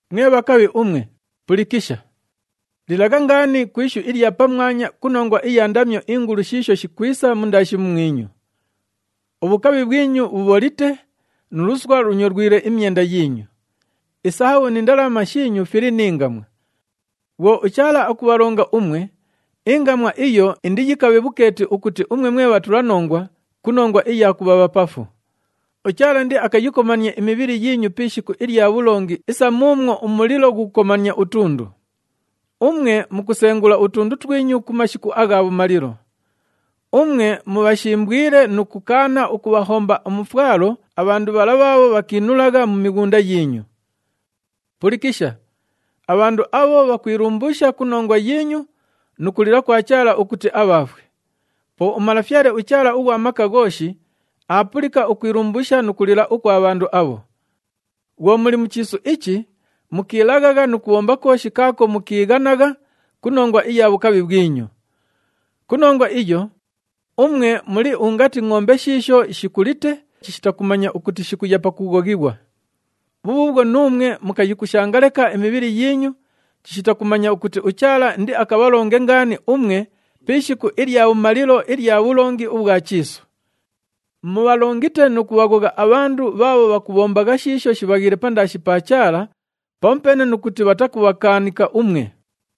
Mwe bhakabhi umwe, pulikisha! Lilagha ngaani ku ishu ilya pamwanya ku nongwa iya ndamyo ingulu shiisho shikwisa mundaashi mumwinyu! Ubhukabhi bhwinyu bhubholite, nu luswa lunyolwile imyenda yiinyu. Isahabhu ni ndalama shiinyu fili ni ngamwa. Bhwo uChaala akubhalonga umwe, ingamwa iyo indiyikabhe bhukeeti ukuti umwe mwe bhatulanongwa ku nongwa iya kubha bhapafu. UChaala indiakayikomanie imibhili yiinyu pi ishiku ilya bhulongi isa muumwo umulilo ghukukomania utundu. Umwe mukusengula utundu twinyu ku mashiku agha bhumalilo. Umwe mubhashimbwile nu kukaana ukubhahomba umufwalo abhandu bhala bhaabho bhakiinulagha mu mighunda yiinyu. Pulikisha, abhandu abho bhakwilumbuusha ku nongwa yiinyu nu kulila kwa Chaala ukuti abhaafwe. Po uMalafyale uChaala ughwa Maka Ghooshi aapulika ukwilumbuusha nu kulila ukwa bhandu abho. Bhwo muli mu chiisu ichi, mukiilaghagha nu kubhomba kooshi kaako mukiighanagha ku nongwa iya bhukabhi bhwinyu. Ku nongwa iyo, umwe muli ungati ngʼombe shiisho shikulite chishita kumanya ukuti shikuya pakughoghighwa. Bhubhuubhwo nuumwe mukayikushanga leka imibhili yiinyu chishita kumanya ukuti uChaala indiakabhalonge ngaani umwe pi ishiku ilya bhumalilo ilya bhulongi ubhwa chiisu. Mubhalongite nu kubhaghogha abhandu bhaabho bhakubhombagha shiisho shibhaghiile pandaashi pa Chaala pamupeene nu kuti bhatakubhakaanika umwe.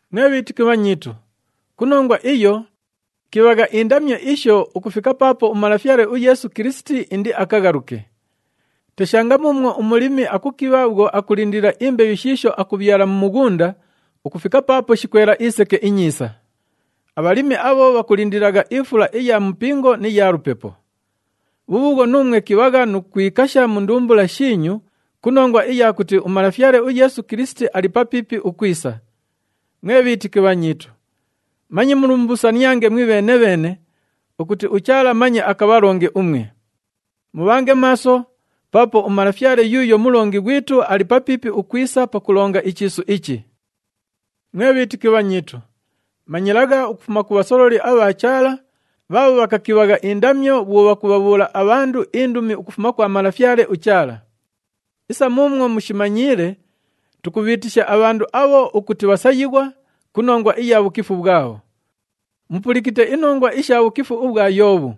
Mwe bhiitiki bhanyiitu, ku nongwa iyo, kibhagha indamyo isho ukufika paapo uMalafyale uYeesu Kilisiti indiakaghaluke. Teshanga muumwo umulimi akukibha bhwo akulindilila imbeyu shiisho akubhyala mu mughunda ukufika paapo shikwela iseke inyiisa. Abhalimi abho bhakulindililagha ifula iya mupingo ni ya lupepo. Bhubhuubhwo, nuumwe kibhagha nu kwikasha mu ndumbula shiinyu ku nongwa iya kuti uMalafyale uYeesu Kilisiti ali papiipi ukwisa. Mwe bhiitiki bhanyiitu, manye mulumbuusaniange mwibheene-bheene ukuti uChaala manye akabhalonge umwe. Mubhange maaso paapo uMalafyale yuuyo Mulongi ghwitu ali papiipi ukwisa pakulonga ichiisu ichi. Mwe bhiitiki bhanyiitu, manyilagha ukufuma ku bhasololi abha Chaala bhaabho bhakakibhagha indamyo bhwo bhakubhabhuula abhandu indumi ukufuma kwa Malafyale uChaala. Isa muumwo mushimanyiile, tukubhiitisha abhandu abho ukuti bhasayighwa ku nongwa iya bhukifu bhwabho. Mupulikite inongwa isha bhukifu ubhwa Yoobhu.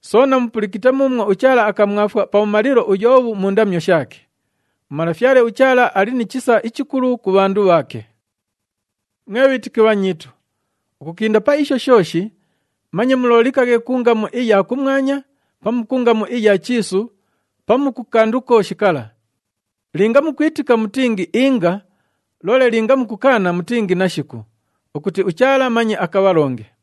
Soona mupulikite muumwo uChaala akamwafwa pabhumalilo uYoobhu mu ndamyo shaake. UMalafyale uChaala ali ni chisa ichikulu ku bhandu bhaake. Mwe bhiitiki bhanyiitu, ukukinda pa isho shooshi, manye muloolikaghe ku ngamu iya kumwanya pamu ku ngamu iya chiisu pamu ku kandu kooshi kala. Linga mukwitika, mutingi, “Inga,” loole linga mukukaana, mutingi, “Nashiku,” ukuti uChaala manye akabhalonge.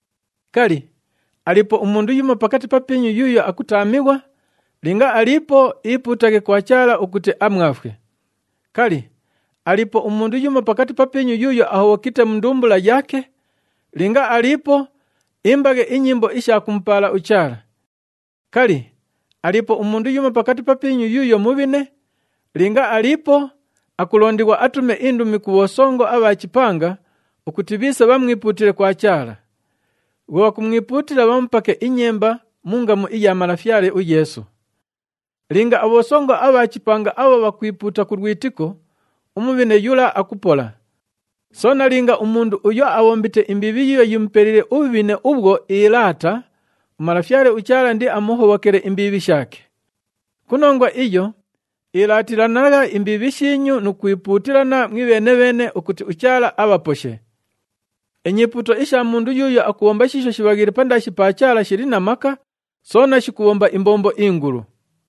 Kali, aliipo umundu yumo pakati papiinyu yuuyo akutaamighwa? Linga aliipo, iipuutaghe kwa Chaala ukuti amwafwe. Kali, aliipo umundu yumo pakati papiinyu yuuyo ahobhokite mu ndumbula yaake? Linga aliipo, imbaghe inyimbo isha kumupaala uChaala. Kali, aliipo umundu yumo pakati papiinyu yuuyo mubhine? Linga aliipo, akulondighwa atume indumi ku bhosongo abha chipanga ukuti bhiise bhamwipuutile kwa Chaala. Bhwo bhakumwipuutila, bhamupake inyemba mu ngamu iya Malafyale uYeesu. Linga abhosongo abha chipanga abho bhakwipuuta ku lwitiko, umubhine yula akupola. Soona linga umundu uyo abhombite imbiibhi yiiyo yimupeliile ubhubhine ubhwo iilaata, uMalafyale uChaala indiamuhobhokele imbiibhi shaake. Ku nongwa iyo, ilaatilanagha imbiibhi shiinyu nu kwipuutilana mwibheene-bheene ukuti uChaala abhaposhe. Inyipuuto isha mundu yuuyo akubhomba shiisho shibhaghiile pandaashi pa Chaala shili na maka, soona shikubhomba imbombo ingulu.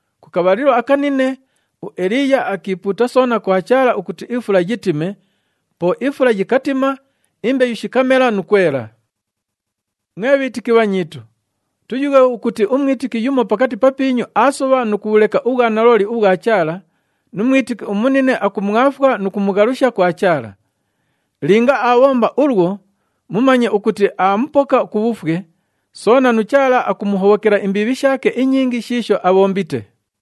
Ku kabhalilo akanine, uEliiya akiipuuta soona kwa Chaala ukuti ifula yitime, po ifula yikatima, imbeyu shikamela nu kwela. Mwe bhiitiki bhanyiitu, tuyughe ukuti umwitiki yumo pakati papiinyu aasobha nu kubhuleka ubhwanalooli ubhwa Chaala nu mwitiki umunine akumwafwa nu kumughalusha kwa Chaala. Linga aabhomba ulwo, mumanye ukuti aamupoka ku bhufwe, soona nu Chaala akumuhobhokela imbiibhi shaake inyingi shiisho abhombite.